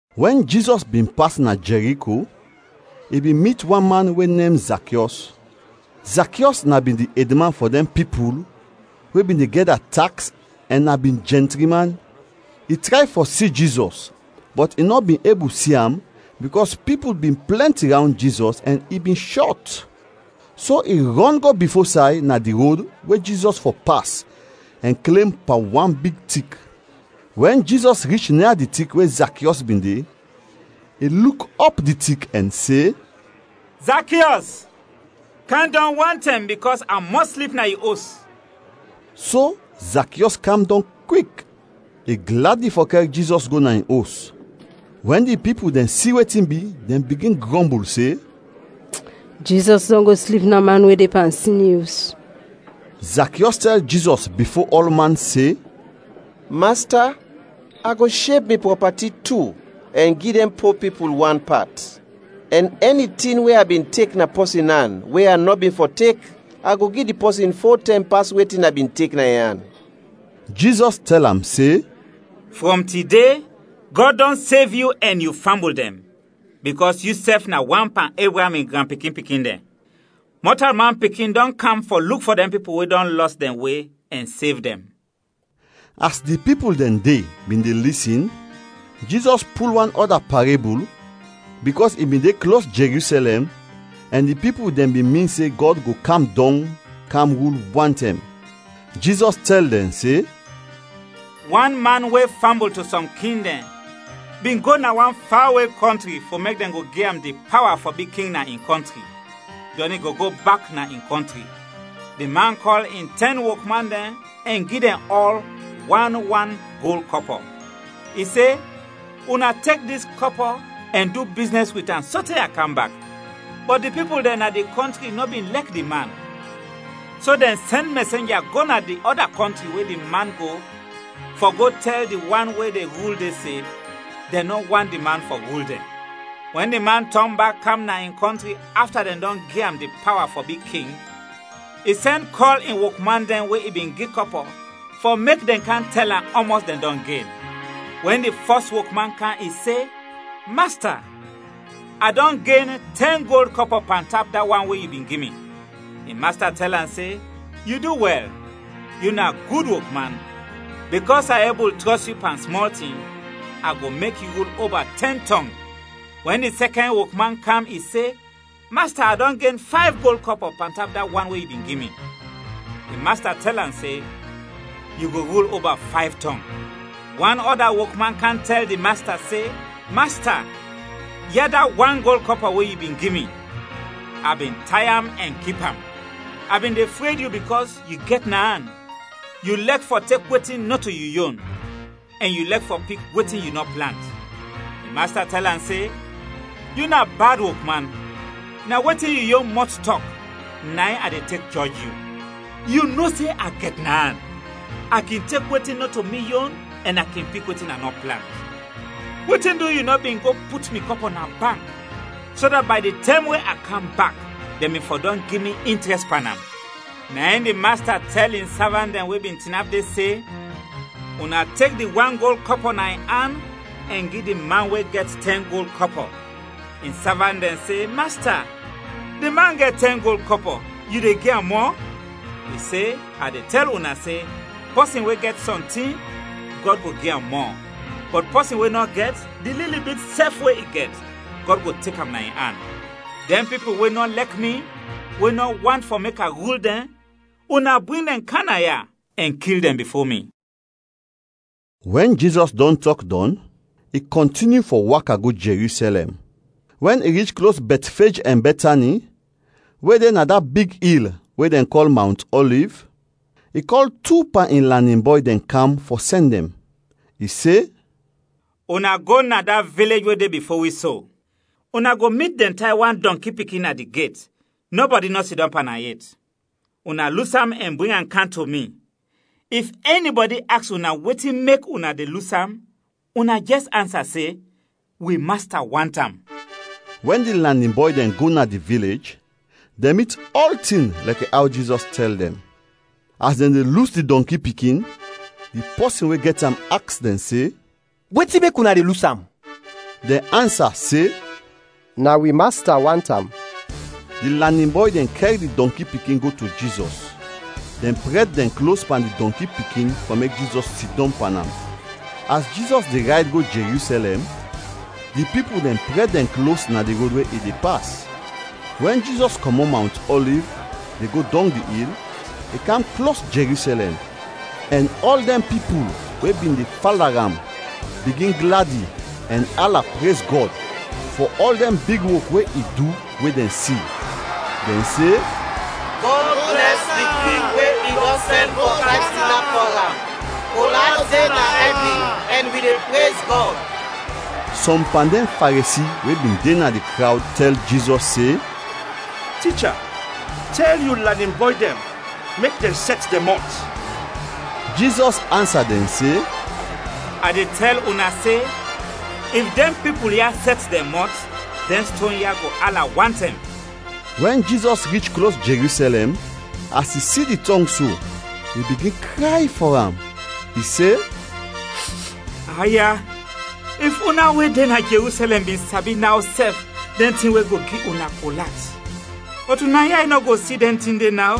Wɛn Jizɔs bin pas na Jɛriko, i bin mit wan man we nem Zakiɔs. Zakiɔs na bin di edman fɔ dɛn pipul we bin de gɛda taks ɛn na bin jɛntri man. I tray fɔ si Jizɔs bɔt i nɔ bin ebul si am bikɔs pipul bin plɛnti rawnd Jizɔs, ɛn i bin shɔt. So i rɔn go bifo say na di rod we Jizɔs fɔ pas ɛn klem pan wan big tik. Wɛn Jizɔs rich nia di tik we Zakiɔs bin de, i luk ɔp di tik ɛn se, “Zakiɔs, kam dɔng wantɛm bikɔs a mɔs slip na yu os.” So Zakiɔs kam dɔng kwik, i gladi fɔ kɛr Jizɔs go na in os. Wɛn di pipul dɛn si wetin bi, dɛn bigin grɔmbul se, “Jizɔs dɔn go slip na man we de pan sin, in os.” Zakiɔs tɛl Jizɔs bifo ɔlman se, “Masta, a go sheb mi prɔpati tu ɛn gi dɛn po pipul wan pat, ɛn ɛni tin we a bin tek na pɔsin an we a nɔ bin fɔ tek a go gi di pɔsin fo tɛm pas wetin a bin tek na in an.” Jizɔs tɛl am se, “Frɔm tide, Gɔd dɔn sev yu ɛn yu fambul dɛn bikɔs yusɛf na wan pan Ebraam in granpikin-pikin dɛn. Mɔtalman Pikin dɔn kam fɔ luk fɔ dɛn pipul we dɔn lɔs dɛn we, ɛn sev dɛn.” As di pipul dɛn de bin de lisin, Jizɔs pul wan ɔda parebul bikɔs i bin de klos Jerusɛlɛm ɛn di pipul dɛn bin min se Gɔd go kam dɔng kam rul wantɛm. Jizɔs tɛl dɛn se, “Wan man we fambul to sɔm king dɛn bin go na wan fawe kɔntri fɔ mek dɛn go gi am di pawa fɔ bi king na in kɔntri; dɔn i go go bak na in kɔntri. Di man kɔl in tɛn wokman dɛn ɛn gi dɛn ɔl wan, wan gold kɔpɔ. I se, ‘Una tek dis kɔpɔ ɛn du biznɛs wit am sote a kam bak.’ Bɔt di pipul dɛn na di kɔntri nɔ bin lɛk di man, so dɛn sɛn mɛsenja go na di ɔda kɔntri we di man go fɔ go tɛl di wan we de rul de se dɛn nɔ want di man fɔ rul dɛn. “Wɛn di man tɔn bak kam na in kɔntri afta dɛn dɔn gi am di pawa fɔ bi king, i sɛn kɔl in wokman dɛn we i bin gi kɔpɔ fɔ mek dɛn kam tɛl am ɔmɔs dɛn dɔn gen. Wɛn di fɔs wokman kam, i se, ‘Masta, a dɔn gen tɛn gold kɔpɔ pantap da wan we yu bin gi mi.’ In masta tɛl am se, ‘Yu du wɛl, yu na gud wokman! Bikɔs a ebul trɔs yu pan smɔl tin, a go mek yu rul oba tɛn tɔng.’ Wɛn di sɛkɛn wokman kam, i se, ‘Masta, a dɔn gen fayv gold kɔpɔ pantap da wan we yu bin gi mi.’ In masta tɛl am se, ‘Yu go rul oba fayv tɔng.’ “Wan ɔda wokman kam tɛl di masta se, ‘Masta, ya da wan gold kɔpɔ we yu bin gi mi, a bin tay am ɛn kip am. A bin de fred yu bikɔs yu gɛt na an. Yu lɛk fɔ tek wetin nɔto yu yon ɛn yu lɛk fɔ pik wetin yu nɔ plant!’ In masta tɛl am se, ‘Yu na bad wokman! Na wetin yu yon mɔt tɔk, na in a de tek jɔj yu! Yu bin no se a gɛt na an; a kin tek wetin nɔto mi yon ɛn a kin pik wetin a nɔ plant, wetin du yu nɔ bin go put mi kɔpɔ na bank so dat bay di tɛm we a kam bak dɛn bin fɔ dɔn gi mi intrɛst pan am?’ “Na in di masta tɛl in savant dɛn we bin tinap de se, ‘Una tek di wan gold kɔpɔ na in an ɛn gi di man we gɛt tɛn gold kɔpɔ.’ In savant dɛn se, ‘Masta, di man gɛt tɛn gold kɔpɔ, yu de gi am mɔ?’ I se, ‘A de tɛl una se, pɔsin we gɛt sɔntin, Gɔd go gi am mɔ; bɔt pɔsin we nɔ gɛt, di lili bit sɛf we i gɛt, Gɔd go tek am na in an. Dɛn pipul we nɔ lɛk mi, we nɔ want fɔ mek a rul dɛn, una bring dɛn kam na ya ɛn kil dɛn bifo mi.’” Wɛn Jizɔs dɔn tɔk dɔn, i kɔntinyu fɔ waka go Jerusɛlɛm. Wɛn i rich klos Bɛtfej ɛn Bɛtani, we de na da big il we dɛn kɔl Mawnt Ɔliv, i kɔl tu pan in lanin bɔy dɛn kam fɔ sɛn dɛn; i se, “Una go na da vilej we de bifo wi so. Una go mit dɛn tay wan dɔnki pikin na di get, nɔbɔdi nɔ sidɔm pan am yet. Una lus am ɛn bring am kam to mi. If ɛnibɔdi aks una wetin mek una de lus am, una jɛs ansa se, ‘Wi Masta want am.’” Wɛn di lanin bɔy dɛn go na di vilej, dɛn mit ɔltin lɛkɛ aw Jizɔs tɛl dɛn. As dɛn de lus di dɔnki pikin, di pɔsin we gɛt am aks dɛn se, “Wetin mek una de lus am?” Dɛn ansa se, “Na wi Masta want am.” Di lanin bɔy dɛn kɛr di dɔnki pikin go to Jizɔs, dɛn prɛd dɛn klos pan di dɔnki pikin fɔ mek Jizɔs sidɔm pan am. As Jizɔs de rayd go Jerusɛlɛm, di pipul dɛn prɛd dɛn klos na di rod we i de pas. Wɛn Jizɔs kɔmɔt Mawnt Ɔliv de go dɔng di il, i kam klos Jerusɛlɛm ɛn ɔl dɛn pipul we bin de fala am bigin gladi ɛn ala prez Gɔd fɔ ɔl dɛn big wok we i du we dɛn si. Dɛn se, “Gɔd blɛs di King we i dɔn sɛn fɔ kam tinap fɔ am! Kol at de na ɛvin ɛn wi de prez Gɔd!” Sɔm pan dɛn Faresi we bin de na di krawd tɛl Jizɔs se, “Ticha, tɛl yu lanin bɔy dɛn mek dɛn sɛt dɛn mɔt.” Jizɔs ansa dɛn se, “A de tɛl una se, if dɛn pipul ya sɛt dɛn mɔt, dɛn ston ya go ala wantɛm!” Wɛn Jizɔs rich klos Jerusɛlɛm, as i si di tɔng so, i bigin kray fɔ am. I se, “Aya, if una we de na Jerusɛlɛm bin sabi naw sɛf dɛn tin we go gi una kol at bɔt una yay nɔ go si dɛn tin de naw.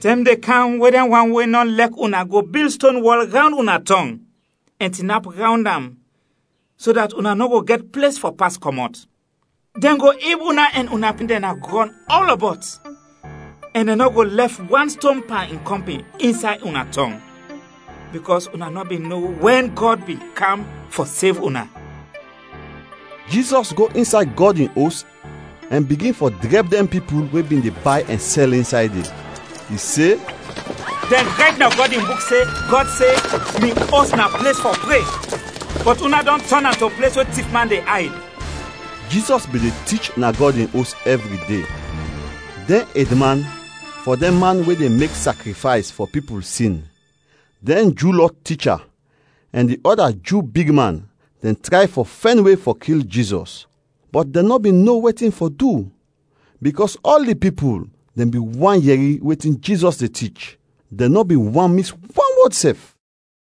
Tɛm de kam we dɛn wan we nɔ lɛk una go bil ston wɔl rawnd una tɔng, ɛn tinap rawnd am so dat una nɔ go gɛt ples fɔ pas kɔmɔt. Dɛn go ib una ɛn una pikin dɛn na grɔn ɔlɔbɔt ɛn dɛn nɔ go lɛf wan ston pan in kɔmpin insay una tɔng, bikɔs una nɔ bin no wɛn Gɔd bin kam fɔ sev una.” Jizɔs go insay Gɔd in Os ɛn bigin fɔ drɛb dɛn pipul we bin de bay ɛn sɛl insay de. I se, “Dɛn rayt na Gɔd in Buk se, Gɔd se, ‘Mi Os na ples fɔ pre,’ bɔt una dɔn tɔn am to ples we tifman de ayd!” Jizɔs bin de tich na Gɔd in Os ɛvri de. Dɛn edman fɔ dɛn man we de mek sakrifays fɔ pipul sin, dɛn Ju Lɔ ticha, ɛn di ɔda Ju bigman dɛn tray fɔ fɛn we fɔ kil Jizɔs, bɔt dɛn nɔ bin no wetin fɔ du bikɔs ɔl di pipul dɛn bin want yɛri wetin Jizɔs de tich, dɛn nɔ bin want mis wan wɔd sɛf.